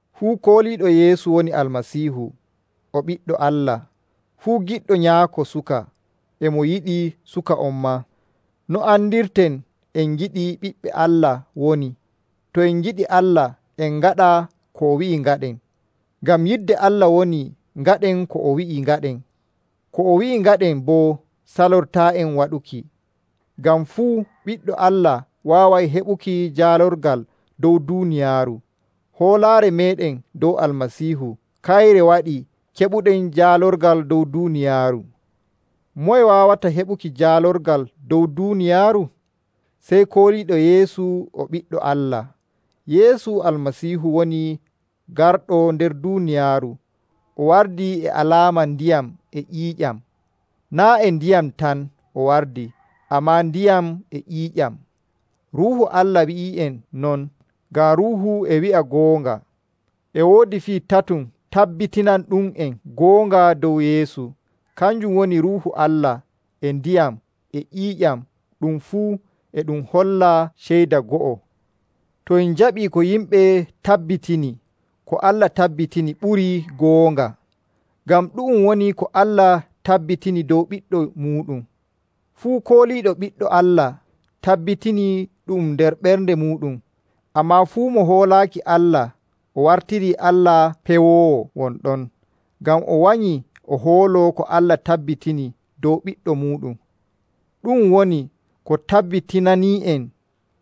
Fuu kooliiɗo Yeesu woni Almasiihu o ɓiɗɗo Allah. Fuu giɗɗo nyaako suka, e mo yiɗi suka on maa. No andirten en ngiɗi ɓiɓɓe Allah woni, to en ngiɗi Allah en ngaɗa ko o wi'i ngaɗen. Ngam yidde Allah woni ngaɗen ko o wi'i ngaɗen. Ko o wi'i ngaɗen boo salortaa'en waɗuki. Ngam fuu ɓiɗɗo Allah waaway heɓuki jaalorgal dow duuniyaaru. Hoolaare meeɗen dow Almasiihu, kayre waɗi keɓuɗen jaalorgal dow duuniyaaru. Moye waawata heɓuki jaalorgal dow duuniyaaru? Sey kooliiɗo Yeesu o Ɓiɗɗo Allah. Yeesu Almasiihu woni garɗo nder duuniyaaru. O wardii e alaama ndiyam e ƴiiƴam. Naa' e ndiyam tan o wardi, ammaa ndiyam e ƴiiƴam. Ruuhu Allah wi'ii'en non, ngam Ruuhu e wi'a goonga. E woodi fii tatum tabbitinanɗum'en goonga dow Yeesu. Kanjum woni Ruuhu Allah, e ndiyam, e ƴiiƴam, ɗum fuu e ɗum holla ceyda go'o. To en njaɓii ko yimɓe tabbitini, ko Allah tabbitini ɓurii goonga. Ngam ɗu'um woni ko Allah tabbitini dow Ɓiɗɗo muuɗum. Fuu kooliiɗo Ɓiɗɗo Allah tabbitinii ɗu'um nder ɓernde muuɗum. Ammaa fuu mo hoolaaki Allah, o wartirii Allah pewoowo won ɗon, ngam o wanyii o hooloo ko Allah tabbitini dow Ɓiɗɗo muuɗum. Ɗu'um woni ko tabbitinani'en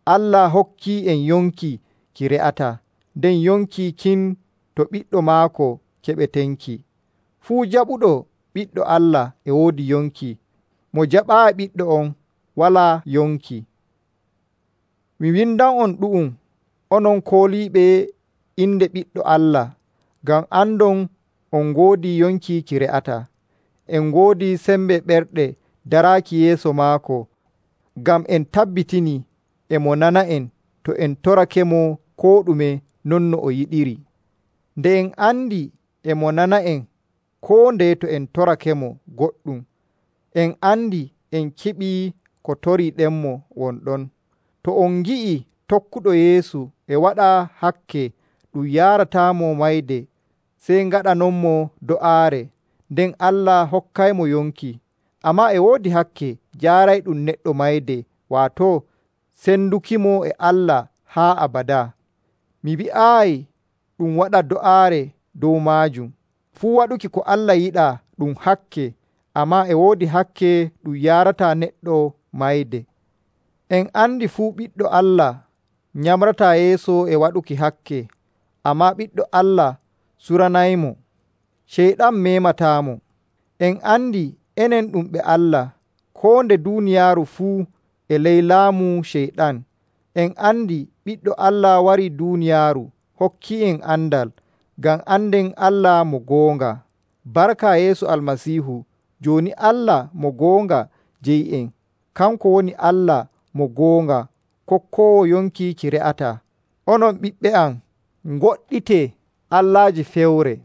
Allah hokkii'en yonki ki re'ataa, nden yonki kin to Ɓiɗɗo maako keɓetenki. Fuu jaɓuɗo Ɓiɗɗo Allah e woodi yonki. Mo jaɓaayi Ɓiɗɗo on, walaa yonki. Mi windan'on ɗu'um, onon kooliiɓe inde Ɓiɗɗo Allah, ngam andon on ngoodi yonki ki re'ataa. En ngoodi sembe ɓerɗe daraaki yeeso maako, ngam en tabbitinii e mo nana'en to en torakemo koo ɗume non no o yiɗiri. Nde en andi e mo nana'en koo ndeye to en torakemo goɗɗum, en andi en keɓii ko toriiɗenmo won ɗon. To on ngi'ii tokkuɗo Yeesu e waɗa hakke ɗum yaarataamo mayde, sey ngaɗanonmo do'aare, nden Allah hokkaymo yonki. Ammaa e woodi hakke jaarayɗum neɗɗo mayde, waato sendukimo e Allah haa abadaa. Mi wi'aayi ɗum waɗa do'aare dow maajum. Fuu waɗuki ko Allah yiɗaa ɗum hakke, ammaa e woodi hakke ɗum yaarataa neɗɗo mayde. En andi fuu ɓiɗɗo Allah nyamrataa yeeso e waɗuki hakke, ammaa Ɓiɗɗo Allah suranaymo. Ceyɗan meemataamo. En andi enen ɗum ɓe Allah, koo nde duuniyaaru fuu e ley laamu Ceyɗan. En andi Ɓiɗɗo Allah warii duuniyaaru hokki'en andal, ngam anden Allah mo goonga. Barka Yeesu Almasiihu, jooni Allah mo goonga jeyi'en. Kanko woni Allah mo goonga, kokkoowo yonki ki re'ataa. Onon ɓiɓɓe am, ngoɗɗitee allaaji fewre.